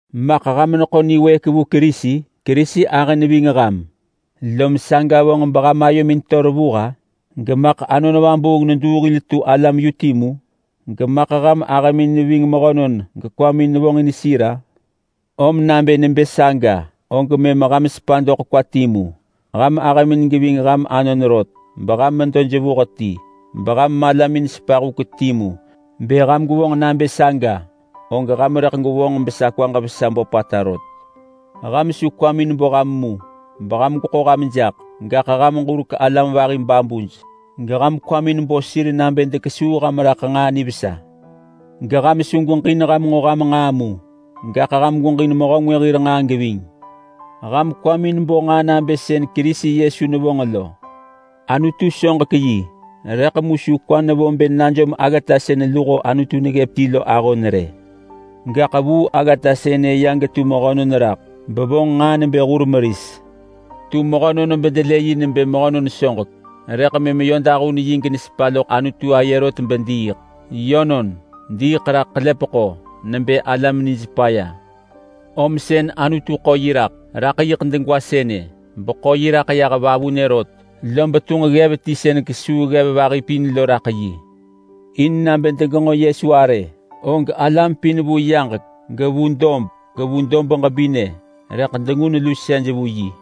Maḳ ham neḳo niwëëk vu Kerisi? Kerisi ahë neving ham lom saga vonġ beham ayomin to revuh-a? Gemaḳ Anon Vabuung neduu hil tu alam yu timu? Gemaḳ ham ahëmin neving mehönon gekwamin nevonġin sir-a? Om nabë nebë saga og mëm ham sepa doḳ kwa timu. Ham ahëmin geving ham anon rot, beham medo jevuh ti, beham malamin sepa huk timu. Bë ham gwevonġ nabë saga, og ham rëḳ gwevonġ besa kwaġ vesa böpata rot. Ham su kwamin bo ham mu beham gweḳo ham jaḳ. Gaḳ ham ġurek alam vahi babuj geham kwamin bo sir nabë dekesuu ham raḳ nġaa nivesa. Geham su gweġin ham nġo ham nġaa mu, gaḳ ham gweġin mehö ngwë hir nġaa geving. Ham kwamin bo nġaa nabë sën Kerisi Yesu nevonġ lo. Anutu soġek yi, rëḳ mu su kwa nevo bë najom aggata sën luho Anutu neggëp ti lo ahon rë. Gaḳ vuu aggata sënë ya getu mehönon raḳ, bevonġ nġaa nebë hur meris. Tu mehönon bedelë yi nebë mehönon soġek, rëḳ mëm yö dahun yi genesepa loḳ Anutu aye rot bediiḳ. Yönon, diiḳ raḳ ḳelepeḳo nebë alam nij paya. Om sën Anutu ḳo yi raḳ, raḳ yiḳ degwa sënë, beḳo yi raḳ yah vavunë rot. Lob tunġ ggev ti sën kesuu ggev vahi pin lo raḳ yi. In nabë degenġo Yesu arë, og alam pin vu yaġek gevu dob gevu dob ġebinë rëḳ dengun lusej vu yi.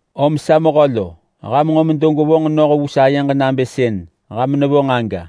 Om sa mehö lo! Ham nġo medo gwevonġ noh vu sayeġ nabë sën ham nevonġ aga.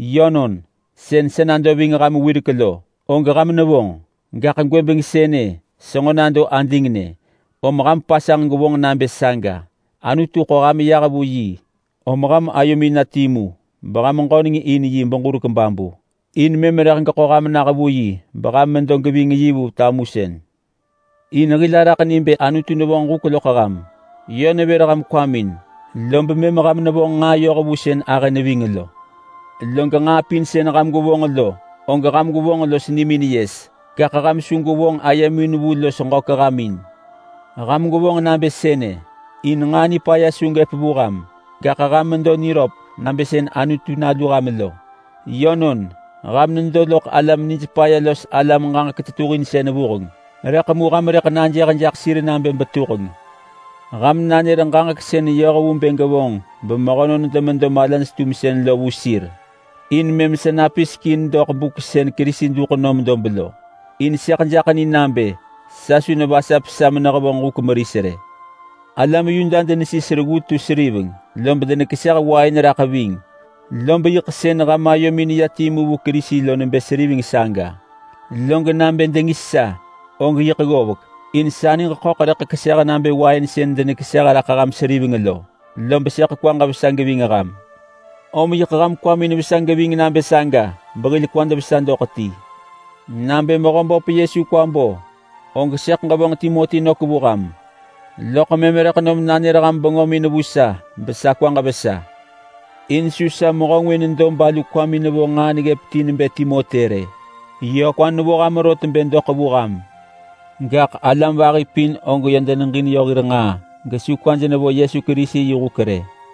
Yönon, sën sa nado ving ham wirek lo og ham nevonġ, gaḳ gwëbeng sënë senġo nado adingnë, om ham pasanġ gwevonġ nabë saga. Anutu ḳo ham yah vu yi om ham ayomin na timu beham ġöneng in yi beġurek babu in mëm rëḳ geḳo ham nah vu yi beham medo geving yi vu tamusën. In hil araḳ ni bë Anutu nevonġ huk loḳ ham. Yö nevër ham kwamin, lob mëm ham nevonġ nġaa yoh vu sën ahë neving lo. Log nġaa pin sën ham gwevonġ lo, og ham gwevonġ los nimin yes, gaḳ ham su gwevonġ ayemin vu los ġök ham in. Ham gwevonġ nabë sënë in nġaa nipaya su gëp vu ham, gaḳ ham medo niröp nabë sën Anutu nalu ham lo. Yönon, ham nedo loḳ alam nij paya los alam ġaġek tetuhinsën vuheng, rëḳ mu ham rëḳ najëh jaḳ sir nabë betuheng. Ham nanër ġaġek sën yoh vu bë gevonġ bemehönon demedo malaj-tumsën lo vu sir in mëm sa napisek in doḳ buk sën Kerisi duḳ nom dob lo. In sëḳ jaḳ ni nabë sa su nevasap sa menehevonġ huk meris rë. Alam Yuda denesis reggu tu seriveng, lob denekeseh wain raḳ ving, lob yiḳ sën ham ayomin neya timu vu Kerisi lo nebë seriveng saga. Log nabë dengis sa, og yiḳ ggovek, in sa niġ ḳöḳ rëḳ keseh nabë wain sën denekeseh raḳ ham seriveng lo, lob sëḳ kwaġ vesa geving ham. Om yiḳ ham kwamin vesa geving nabë saga behil kwad vesa doḳ ti. Nabë Mehöböp Yesu kwa bo, og sëḳ ġevonġ Timoti nök vu ham, loḳ mëm rëḳ nom nanër ham bengömin vu sa besa kwaġ vesa. In su sa mehö ngwë nedo balu kwamin nevo nġaa neggëp ti nebë Timoti rë. Yö kwa nevo ham rot bë doḳ vu ham. Gaḳ alam vahi pin og yö deneġin yö hir nġaa gesu kwaj nevo Yesu Kerisi yi huk rë.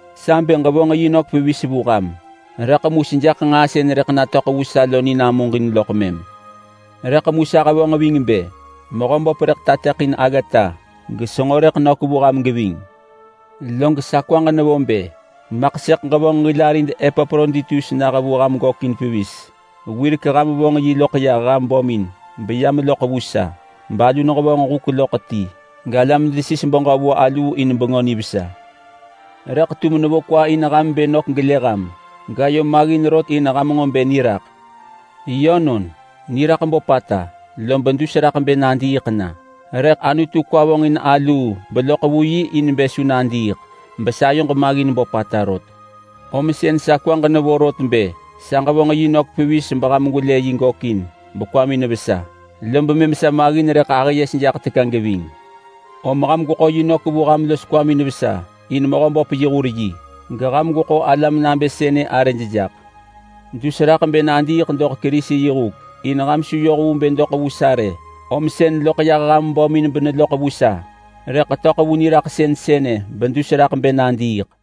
Sa bë ġevonġ yi nök pevis vu ham, rëḳ mu sejaḳ nġaa sën rëḳ natöḳ vu sa lo ni namuġin loḳ mëm. Rëḳ mu sa hevonġ ving bë Mehöböp rëḳ tateḳin aggata gesenġo rëḳ nök vu ham geving. Log sa kwaġ nevo bë maḳ sëḳ ġevonġ hil arid Epaproditus nah vu ham gökin pevis. Wirek ham vonġ yi loḳ yah ham bömin beyam loḳ vu sa, balu nehevonġ huk loḳ ti galam desis beġö vu aluu in Bengö Nivesa. Rëḳ tum nevo kwa in ham bë nök gelë ham. Gayo maggin rot in ham nġo bë niraḳ. Yönon, niraḳ böpata lob dus raḳ bë nadiiḳ na. Rëḳ Anutu kwa vonġin aluu beloḳ vu yi in bë su nadiiḳ besayoġ maggin böpata rot rë. Om sën sa kwaġ nevo rot bë sa ġevonġ yi nök pevis beham gwelë yi gökin bekwamin vesa lob mëm sa maggin rëḳ ahë yes jaḳ teka geving. Om ham gweḳo yi nök vu ham los kwamin vesa in Mehöböp yi hur yi. Geham gweḳo alam nabë sënë arëj jaḳ. Dus raḳ bë nadiiḳ doḳ Kerisi yi huk. In ham su yoh vu bë doḳ vu sa rë, om sën loḳ yah ham bömin beneloḳ vu sa, rëḳ töḳ vu niraḳsën sënë bedus raḳ bë nadiiḳ.